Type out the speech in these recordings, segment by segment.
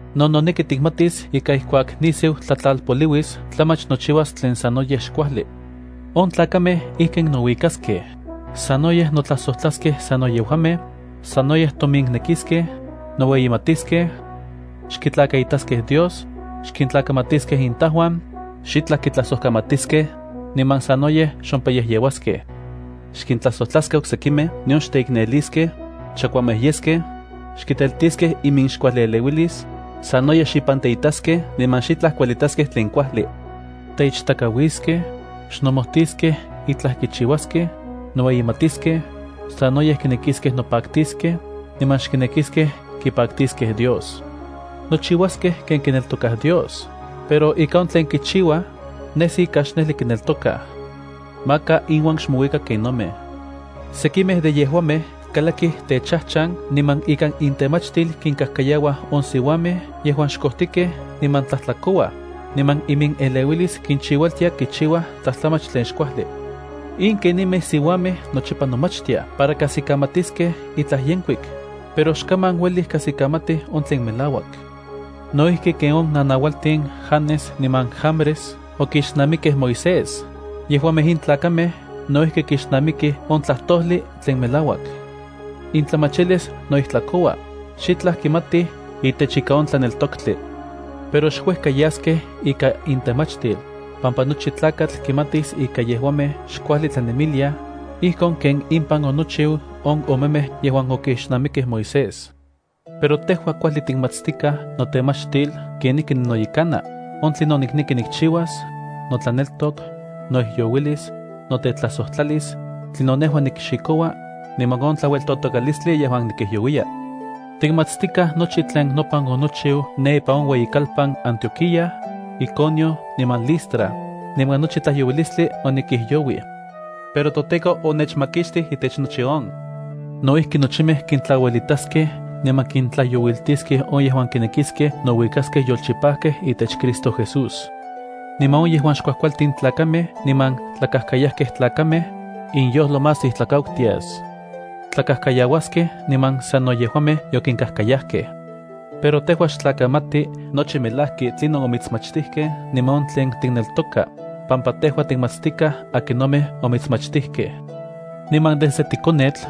No noneki tikmatis ika ijkuak nisiu tlatlalpoliuis tlamach nochiuas tlen sanoyej xkuajli. On tlakamej ijkin nouikaskej: sanoyej notlajsojtlaskej sano yejuamej, sanoyej tominnekiskej, noueyimatiskej, xkitlakaitaskej Dios, xkintlakamatiskej intajuan, xitlaj kitlajsojkamatiskej, niman sanoyej xompayejyeuaskej. Xkintlajsojtlaskej oksekimej nion xteikneliskej, chakuamej yeskej, xkiteltiskej iminxkuajlieleuilis, sanoyej xipanteitaskej niman xitlaj kuelitaskej tlen kuajli. Teichtakauiskej, xnomojtiskej itlaj kichiuaskej, noueyimatiskej, sanoyej kinekiskej nopaktiskej, niman xkinekiskej kipaktiskej Dios. Nochiuaskej ken kineltokaj Dios, pero ika on tlen kichiuaj nesi ika xnejli kineltokaj. Maka inuan xmouika kennomej. Sekimej de yejuamej kalakij techajchan niman ikan intemachtil kinkajkayauaj on siuajmej yejuan xkojtikej niman tlajtlakouaj, niman imineleuilis kinchiualtia kichiuaj tlajtlamach tlen xkuajli. In kenimej siuamej nochipa nomachtiaj para kajsikamatiskej itlaj yenkuik, pero xkaman uelij kajsikamatij on tlen melauak. No ijki ken on nanaualtin Janes niman Jambrés okixnamikej Moisés, yejuamej in tlakamej no ijki kixnamikij on tlajtojli tlen melauak. Intlamachilis noijtlakoua, xitlaj kimatij itech ika on tlaneltoktli. Pero xuejka yaskej ika intemachtil, pampa nochi tlakatl kimatis ika yejuamej xkuajli tlanemiliaj, ijkon ken impan onochiu on omemej yejuan okixnamikej Moisés. Pero tejua kuajli tikmatstikaj notemachtil kenijki ninoyekana, on tlinon nikneki nikchiuas, notlaneltok, noijyouilis, notetlajsojtlalis, tlinon nejua nikxikoua, niman on tlaueltotokalistli yejuan nikijyouiya. Tikmatstikaj nochi tlen nopan onochiu ne ipan on uejueyikalpan Antioquía, Iconio niman Listra, niman nochi tlajyouiltilistli onikijyouij. Pero toTEKO onechmakixtij itech nochi on. No ijki nochimej kintlauelitaskej niman kintlajyoulitiskej on yejuan kinekiskej nouikaskej yolchipajkej itech Cristo Jesús. Niman on yejuan xkuajkualtin tlakamej niman tlakajkayajkej tlakamej, inyojlo más ijtlakautias. Tlakajkayauaskej niman sano yejuamej yokinkajkayajkej. Pero tejua xtlakamati nochipa melajki tlinon omitsmachtijkej niman on tlen tikneltoka, pampa tejua tikmatstikaj akinomej omitsmachtijkej. Niman desde tikonetl,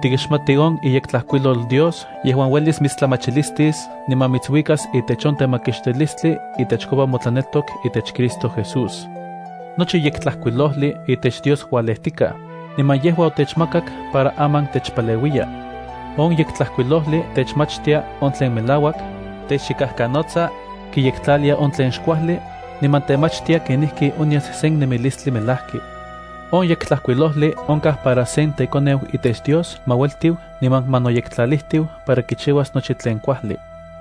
tikixmati on iYektlajkuilol Dios yejuan uelis mitstlamachilistis niman mitsuikas itech on temakixtilistli itechkopa motlaneltok itech Cristo Jesús. Nochi Yektlajkuilojli itech Dios ualejtikaj, niman yejua otechmakak para aman techpaleuiya. On Yektlajkuilojli techmachtia on tlen melauak, techchikajkanotsa, kiyektlalia on tlen xkuajli, niman temachtia kenijki onyas sen nemilistli melajki. On Yektlajkuilojli onkaj para sen tekoneu itech Dios ma ueltiu niman ma noyektlalijtiu para kichiuas nochi tlen kuajli.